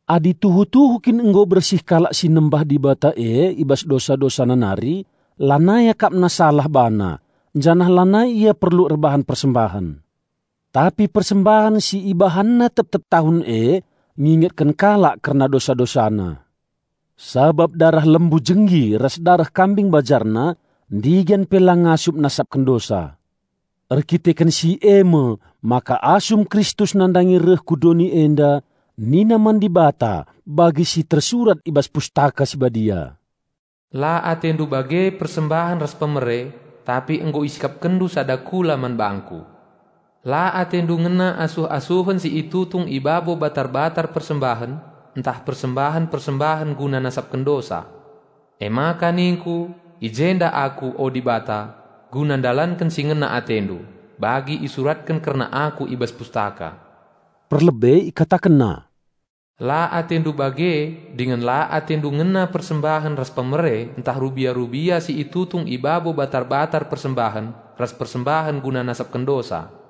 Adi tuhu-tuhu kin nggo bersih kalak si nembah Dibata e i bas dosa-dosana nari, lanai akapna salah bana, janah lanai ia perlu erbahan persembahen. Tapi persembahen si ibahanna tep-tep tahun e ngingetken kalak kerna dosa-dosana. Sabap dareh lembu jenggi ras dareh kambing bajarna ndigan pe la ngasup nasapken dosa. Erdandanken si e me maka asum Kristus nandangi reh ku doni enda nina man Dibata bagi si tersurat i bas Pustaka Si Badia, "La atendu bage persembahen ras pemere, tapi nggo IsikapkenNdu sada kula man bangKu. La AteNdu ngena asuh-asuhen si itutung i babo batar-batar persembahen, ntah persembahen-persembahen guna nasapken dosa. Emaka ningku, 'I jenda Aku, o Dibata, guna ndalanken si ngena AteNdu, bagi isuratken kerna Aku i bas Pustaka.'" Perlebe IkatakenNa, "La AteNdu bage dingen la AteNdu ngena persembahen ras pemere ntah rubia-rubia si itutung i babo batar-batar persembahen ras persembahen guna nasapken dosa."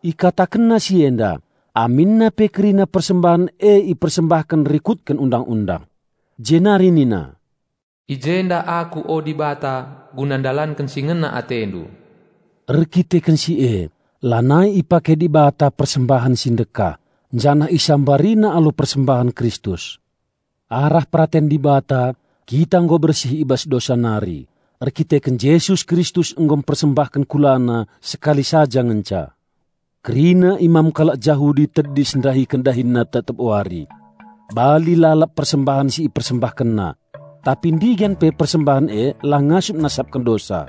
IkatakenNa si enda aminna pe kerina persembahen e ipersembahken rikutken Undang-undang. Jenari nina, "I jenda Aku, o Dibata, guna ndalanken si ngena AteNdu." Erdandanken si e lanai ipake Dibata persembahen si ndekah, janah IsambariNa alu persembahen Kristus. Arah peraten Dibata kita nggo bersih i bas dosa nari, erkiteken Jesus Kristus nggo mpersembahken KulaNa sekali saja ngenca. Kerina imam kalak Jahudi tedis ndahiken dahinna tep-tep wari. Bali lalap persembahen si ipersembahkenna. Tapi ndigan pe persembahen e la ngasup nasapken dosa.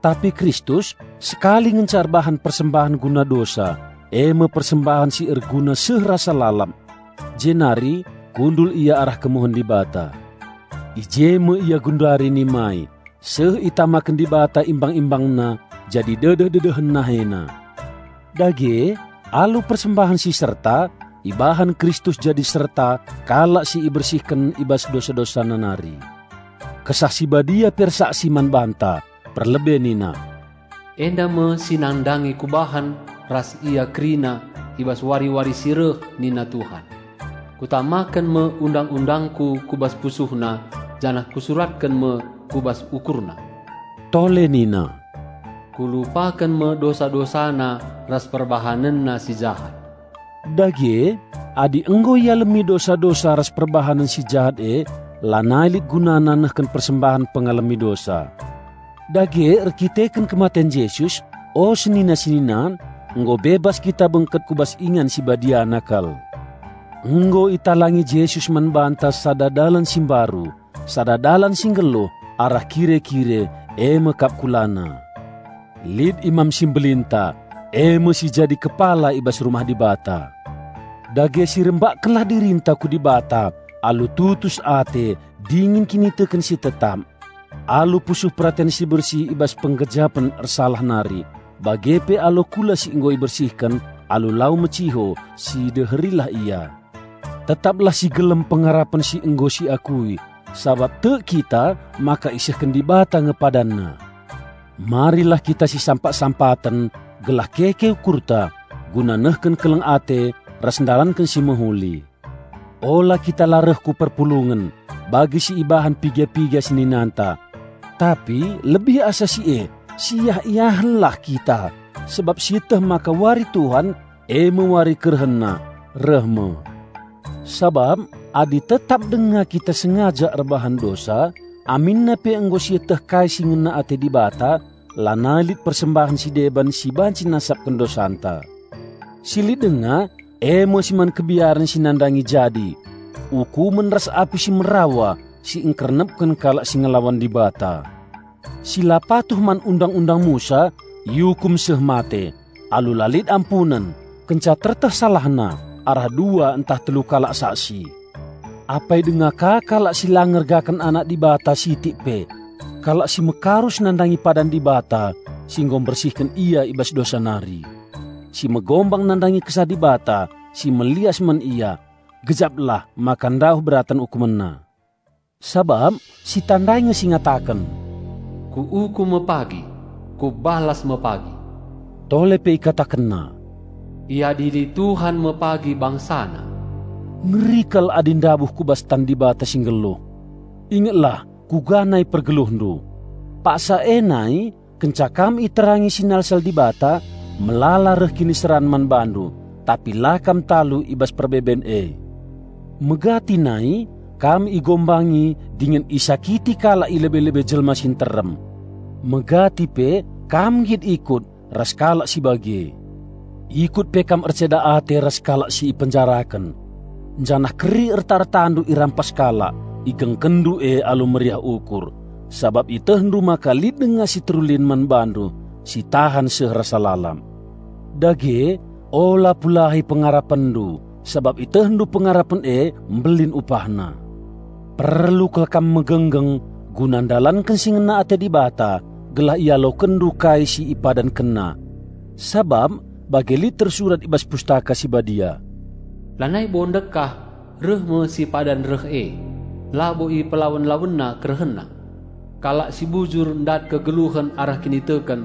Tapi Kristus sekali ngenca erbahan persembahen guna dosa, e me persembahen si erguna seh rasa lalap; jenari kundul Ia arah kemuhen Dibata. I je me Ia genduari nimai, seh itamaken Dibata imbang-ImbangNa jadi dedeh-dedehen NaheNa. Dage alu persembahen si serta, ibahan Kristus jadi serta kalak si ibersihken i bas dosa-dosana nari. Kesah Si Badia pe ersaksi man banta. Perlebe nina, "Enda me si nandangi Kubahan ras ia kerina i bas wari-wari si reh nina Tuhan: Kutamaken me Undang-undangKu ku bas pusuhna, janah Kusuratken me ku bas ukurna." Tole nina, "Kulupaken me dosa-dosana ras perbahanenna si jahat." Dage adi nggo ialemi dosa-dosa ras perbahanen si jahat e, lanai lit gunana nehken persembahen pengalemi dosa. Dage erdandanken kematen Jesus, o senina-senina, nggo bebas kita bengket ku bas Ingan Sibadiana kal. Nggo italangi Jesus man banta sada dalan si mbaru, sada dalan si nggeluh, arah kire-kire, e me kap KulaNa. Lit Imam Simbelinta; e me si jadi kepala i bas rumah Dibata. Dage sirembakkenlah dirinta ku Dibata alu tutus ate dingen kiniteken si tetap. Alu pusuh peraten si bersih i bas penggejapen ersalah nari, bage pe alu kula si nggo ibersihken alu lau meciho, sideherilah Ia. Tetaplah si gelem pengarapen si nggo siakui, sabap tek kita maka isehken Dibata nge PadanNa. Marilah kita sisampat-sampaten gelah keke ukurta guna nehken keleng ate ras ndalanken si mehuli. Ula kita la reh ku perpulungen, bagi si ibahan piga-piga seninanta. Tapi lebih asa si e siiah-iahenlah kita sabap sieteh maka wari Tuhan, e me wari KerehenNa, reh me. Sabap adi tetap denga kita sengaja erbahan dosa, aminna pe nggo sieteh kai si ngena ate Dibata, lanai lit persembahen si deban si banci nasapken dosanta. Si lit denga e me si man kebiaren si nandangi jadi: ukumen ras api si merawa si engkernepken kalak si ngelawan Dibata! Si la patuh man Undang-undang Musa iukum seh mate, alu la lit ampunen, kenca tereteh salahna arah dua ntah telu kalak saksi. Apai denga ka kalak si la ngergaken Anak Dibata sitik pe! Kalak si mekarus nandangi padan Dibata si nggo mbersihken ia i bas dosa nari! Si megombang nandangi Kesah Dibata si melias man ia! Gejaplah maka ndauh beraten ukumenna! Sabap sitandai nge si ngataken, "Kuukum me pagi! Kubalas me pagi!" Tole pe IkatakenNa, "Iadili Tuhan me pagi BangsaNa." Ngeri kal adi ndabuh ku bas tan Dibata si nggeluh. Ingetlah kuga nai pergeluhndu. Paksa e nai, kenca kam iterangi sinalsal Dibata, melala reh kiniseran man bandu, tapi la kam talu i bas perbeben e. Megati nai kam igombangi dingen isakiti kalak i lebe-lebe jelma si nterem. Megati pe kam nggit ikut ras kalak si bage. Ikut pe kam erceda ate ras kalak si ipenjaraken. Janah keri erta-ertandu irampas kalak, igengkenndu e alu meriah ukur, sabap ietehndu maka lit denga si terulin man bandu, si tahan seh rasa lalap. Dage ula pulahi pengarapenndu, sabap ietehndu pengarapen e mbelin upahna. Perlu kal kam megenggeng guna ndalanken si ngena ate Dibata gelah ialokenndu kai si IpadankenNa. Sabap bagi lit tersurat i bas Pustaka Si Badia, "Lanai bo ndekah reh me si padan reh e, labo ipelawen-lawenna KerehenNa. Kalak si bujur ndat kegeluhen arah kiniteken.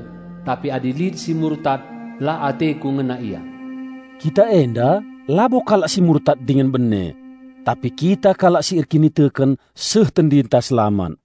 Tapi adi lit si murtad la ateKu ngena ia." Kita enda labo kalak si murtad dingen bene. Tapi kita kalak si erkiniteken seh tendinta selamat.